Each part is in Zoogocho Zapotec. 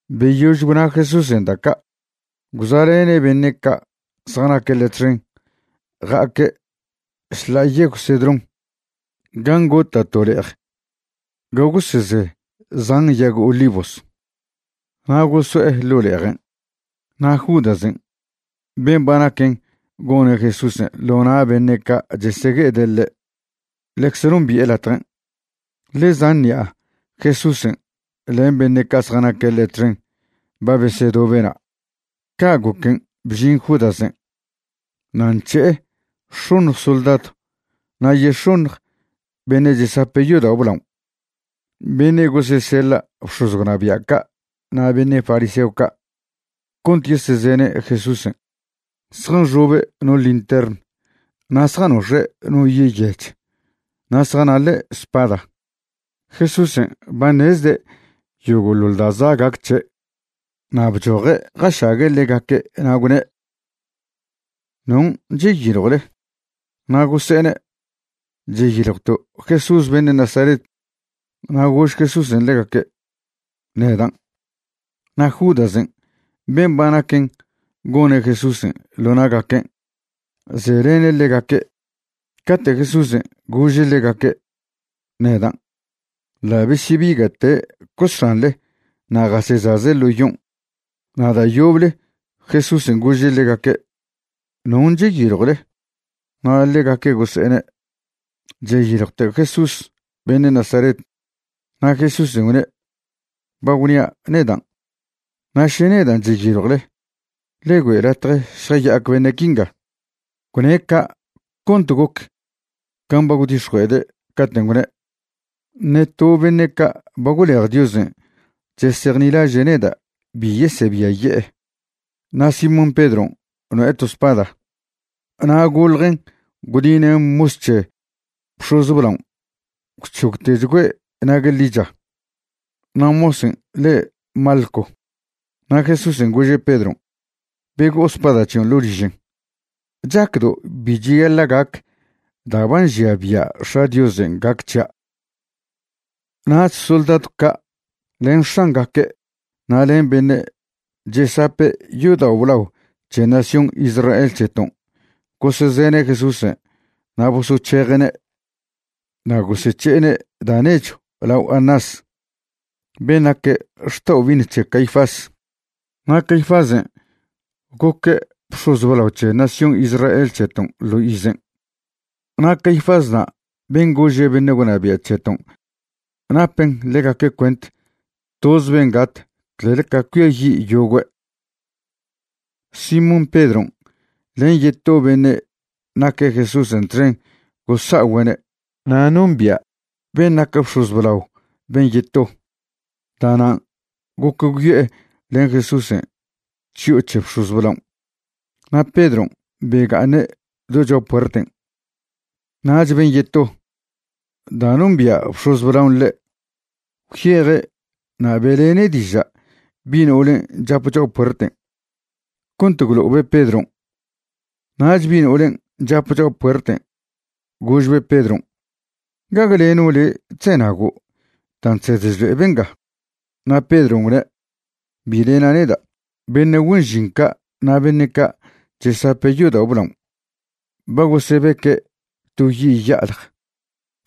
Beyož gwna Jesúsen' da' ca', gwza'lene' beṉe' ca' zjanaque' ḻe' txen ja'aque' šḻa'a Yegw Cedrón gan' gota' to le'ej ga goseze zan yag olivos. Na' goso'e ḻo' le'ejen'. Na' Judasen' ben' ba naquen gone' Jesúsen' ḻo na' beṉe' ca' chesegue'ede' ḻe' ḻecze nombi'e latjen', ḻe zan ṉi'a Jesúsen' len beṉe' ca' zjanaque' ḻe' txen ba besedobe' na'. Ca' goquen' bžin Judasen' na' nc̱he'e x̱oṉj soldadw na' yex̱oṉj beṉe' chesape' yodao' blaon' beṉe' goseseḻa' bx̱oz gwnabia' ca' na' beṉe' fariseo ca' cont yesezene' Jesúsen'. Zjanxobe' no lintern na' zjanox̱e' no yi' yech na' zjanaḻe' spada. Jesúsen' ba ṉezde' yogo'ḻoḻ da' za' gac c̱he', na' bchoje' jašague' ḻegaque' na' gwne': ―¿Non' cheyiljwle? Na' gose'ene': ―Cheyiljwto' Jesús beṉe' Nazaret. Na' gož Jesúsen' ḻegaque': ―Nedan'. Na' Judasen' ben' ba naquen gone' Jesúsen' ḻo na'gaquen' zelene' ḻegaque'. Cate' Jesúsen' gože' ḻegaque': “Nedan”, ḻa' besyebiga'te' cosxanḻe na' jasechaze' ḻo yon'. Na' da' yoble Jesúsen' gože' ḻegaque': ―¿Non' cheyiljwle? Na' ḻegaque' gose'ene': ―Cheyiljwto' Jesús beṉe' Nazaret. Na' Jesúsen' gwne': ―Ba gwnia' nedan'. Na' še nedan' cheyiljwle, ḻe güe' latje šjaya'ac beṉe' quinga. Gwne' ca' cont goc can' ba gwdix̱jue'ede' caten' gwne': “Ṉe to beṉe' ca' ba gwlej Diosen' chesejnilaže' neda' bi yesebiaye'e.” Na' Simón Pedron' no'e to spada na' goḻjen' gwdinen' mos c̱he bx̱oz blaon' gwc̱hogtechgüe' nague' ḻicha. Na' mosen' le' Malco. Na' Jesúsen' gože' Pedron': ―Bego'o spada c̱hion' ḻo' ližen'. ¿Chacdo' bi cheyaḻa' gac da' ba nžia bia' X̱a' Diosen' gac c̱hia'? Nach soldadw ca' len x̱angaque' na' len beṉe' chesape' yodao' blao c̱he nación Israel c̱heton' gosezene' Jesúsen' na' bosoc̱heje'ne'. Na' gosec̱he'ene' da' nechw lao Anás ben' naque' xta'obi'iṉ c̱he Caifás. Na' Caifásen' goque' bx̱oz blao c̱he nación Israel c̱heton' ḻo izen'. Na' Caifásna' ben' gože' beṉe' gwnabia' c̱heton' napen ḻegaque' cuent toz ben' gat clel ca cuiayi' yogüe'. Simón Pedron' len yeto beṉe' naque' Jesúsen' txen gosa'ogüe'ne'. Na' nombia' ben' nac bx̱oz blao ben' yeto. Da'nan' goc gwyo'e len Jesúsen' chyo'o c̱he bx̱oz blaon'. Na' Pedron' bega'aṉe' do cho'a puerten'. Nach ben' yeto, da' nombia' bx̱oz blaon' ḻe', gwyeje' na' be'lene' diža' bi' no'olen' chap cho'a puerten' cont gwlo'obe' Pedron'. Nach bi' no'olen' chape cho'a puerten' gožbe' Pedron': ―¿Gague leno' le' chzenago' dan' chsed chlo'e benga? Na' Pedron' gwne': ―Bi lena' neda'. Beṉe' güen žin ca' na' beṉe' ca' chesape' yodao' blaon' ba gosebeque' to yi' ya'alj,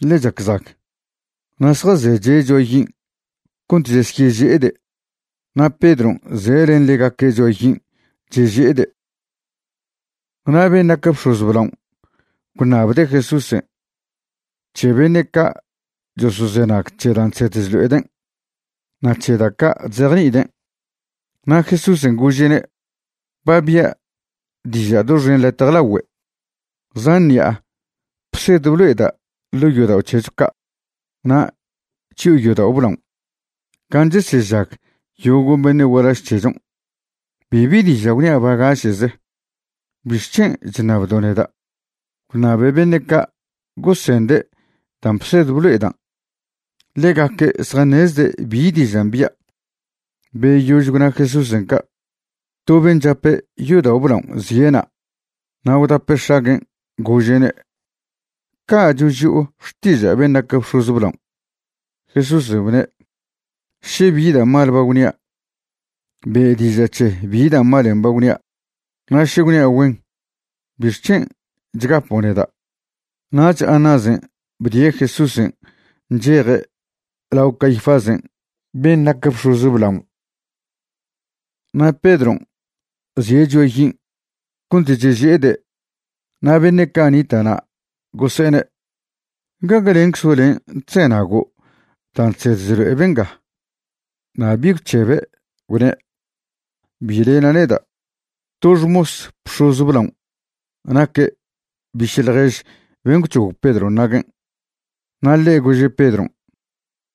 ḻe chac zag, na' zjazeche' cho'a yin' cont chesyeže'ede'. Na' Pedron' ze' len ḻegaque' cho'a yin' cheže'ede'. Na' ben' nac bx̱oz blaon' gwṉabde' Jesúsen' c̱he beṉe' ca' chosozenag c̱he dan' chsed chlo'eden' na' c̱he da' ca' chzejni'iden'. Na' Jesúsen' gože'ne': ―Ba bi'a diža' doxen latje lagüe. Zan ṉi'a bsed blo'eda' ḻo' yodao' c̱hecho ca' na' chyo'o yodao' blaon' gan' chesežag yogo' beṉe' gualaž c̱hechon'. Bibi diža' gwnia' bagaše'ze. ¿Bixc̱hen' chṉabdo' neda'? Gwṉabe beṉe' ca' gosende' dan' bsed blo'edan'. Ḻegaque' zjaṉezde' bi dižan' bia'. Beyož gwna Jesúsen' ca', to ben' chape yodao' blaon' zie' na', na' gwdape' x̱aguen', gože'ne': ―¿Ca' choži'o xtiža' ben' nac bx̱oz blaon'? Jesúsen' gwne': ―Še bi da' mal ba gwnia', be' diža' c̱he bi da' malen' ba gwnia', na' še gwnia' güen, ¿bixc̱hen' chgapo' neda'? Nach Anásen' bdie' Jesúsen' ncheje' lao Caifásen' ben' nac bx̱oz blaon'. Na' Pedron' zie' cho'a yin' cont cheže'ede' na' beṉe' ca' nita'na' gose'ene': ―¿Gague lenczo' len' chzenago' dan' chsed chlo'e benga? Na' bi gwc̱hebe', gwne': ―Bi lena' neda'. To xmos bx̱oz blaon' naque' biše' ḻjež ben' gwc̱hog Pedron' naguen', na' ḻe' gože' Pedron':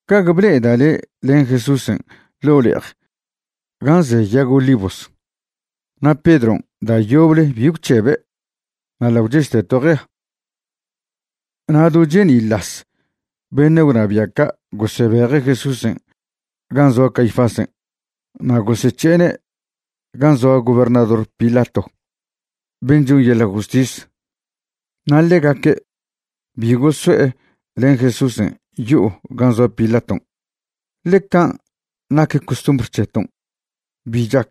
―¿Gague ble'eda' le' len Jesúsen' ḻo' le'ej gan' ze yag olivos? Na' Pedron' da' yoble bi gwc̱hebe', na' ḻa' gwchežte to jea. Na' do cheni'las beṉe' gwnabia' ca' gosebeje' Jesúsen' gan' zoa Caifásen' na' gosec̱he'ene' gan' zoa gobernador Pilato ben' chon yeḻa' justis. Na' ḻegaque' bi goso'e len Jesúsen' yo'o gan' zoa Pilaton', ḻe can' nac costumbr c̱heton' bi chac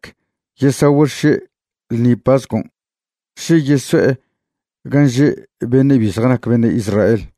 yesagüe' xše' ḻṉi pascon' še yeso'e gan' že' beṉe' bi zjanac beṉe' Israel.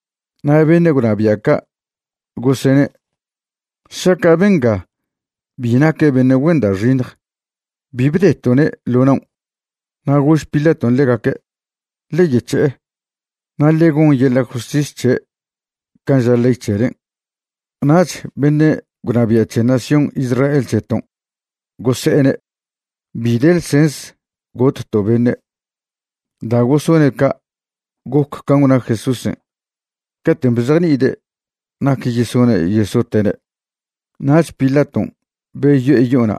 Na' beṉe' gwnabia' ca' gosene': ―Šaca' benga bi naque' beṉe' güen da' xiṉj bi bdeto'ne' ḻo naon'. Na' gož Pilaton' ḻegaque': ―Ḻe yec̱he'e, na' ḻe gon yeḻa' justis c̱he' can' ža ley c̱helen'. Nach beṉe' gwnabia' c̱he nación Israel c̱heton' gose'ene': ―Bi de ḻsens gotto' beṉe'. Da' gosone' ca' goc can' gwna Jesúsen' caten' bzejni'ide' nac yesone' yesote'ne'. Nach Pilaton' beyo'e yo'ona'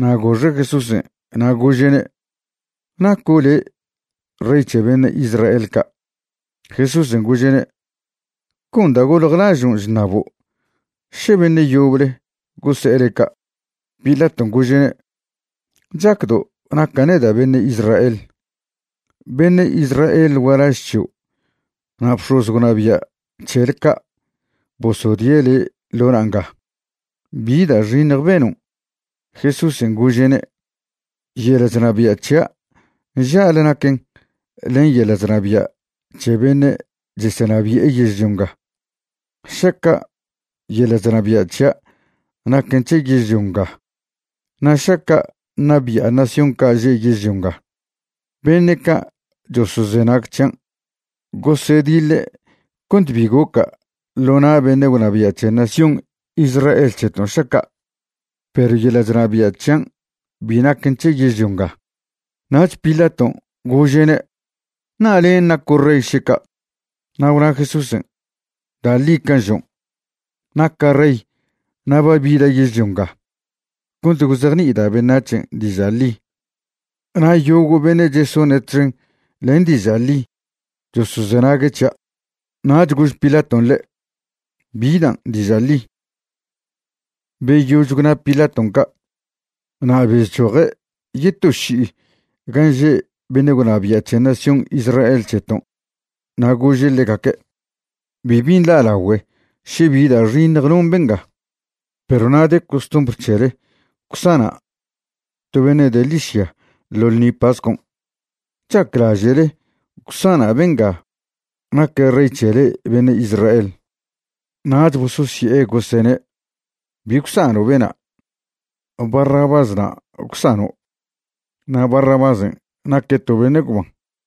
na' goxe' Jesúsen' na' gože'ne': ―¿Naco' le' Rey c̱he beṉe' Israel ca'? Jesúsen' gože'ne': ―¿Con da' goljlažon' chṉabo', še beṉe' yoble gose'e le' ca'? Pilaton' gože'ne': ―¿Chacdo' naca' neda' beṉe' Israel? Beṉe' Israel gualaž c̱hio' na' bx̱oz gwnabia' c̱hele ca' bosodie' le' ḻo na' nga. ¿Bi da' xiṉj benon'? Jesúsen' gože'ne': ―Yeḻa' chnabia' c̱hia' nža'le naquen len yeḻa' chnabia' c̱he beṉe' chesenabi'e yežlio nga. Šaca' yeḻa' chnabia' c̱hia' naquen c̱he yežlio nga na' šaca' ṉabi'a nación ca' že' yežlio nga, beṉe' ca' chosozenag c̱hian' gosediḻe' cont bi goca' ḻo na' beṉe' gwnabia' c̱he nación Israel c̱heton' šaca'. Perw yeḻa' chnabia' c̱hian' bi naquen c̱he yežlio nga. Nach Pilaton' gože'ne': ―¿Na' len' naco' rey še ca'? Na' gwna Jesúsen': ―Da' ḻi can' žon', naca' rey na' ba bida' yežlio nga cont gwzejni'ida' beṉac̱hen' diža' ḻi na' yogo' beṉe' chesone' txen len diža' ḻi chosozenague' c̱hia'. Nach gož Pilaton' le': ―¿Bi dan' diža' ḻi? Beyož gwna Pilaton' ca' na' bezchoje' yeto ši'i gan' že' beṉe' gwnabia' c̱he nación Israel c̱heton' na' gože' ḻegaque': ―Bibi nḻa'lagüe še bi da' xiṉj non benga. Perw na' de costumbr c̱hele gwsana' to beṉe' de ḻižya ḻo ḻṉi pascon'. ¿Chaclaže'le gwsana' benga naque' Rey c̱he le'e beṉe' Israel? Nach bososye'e gosene': ―Bi gwsano' bena'. Barrabás na' gwsano'. Na' Barrabásen' naque' to beṉe' gwban.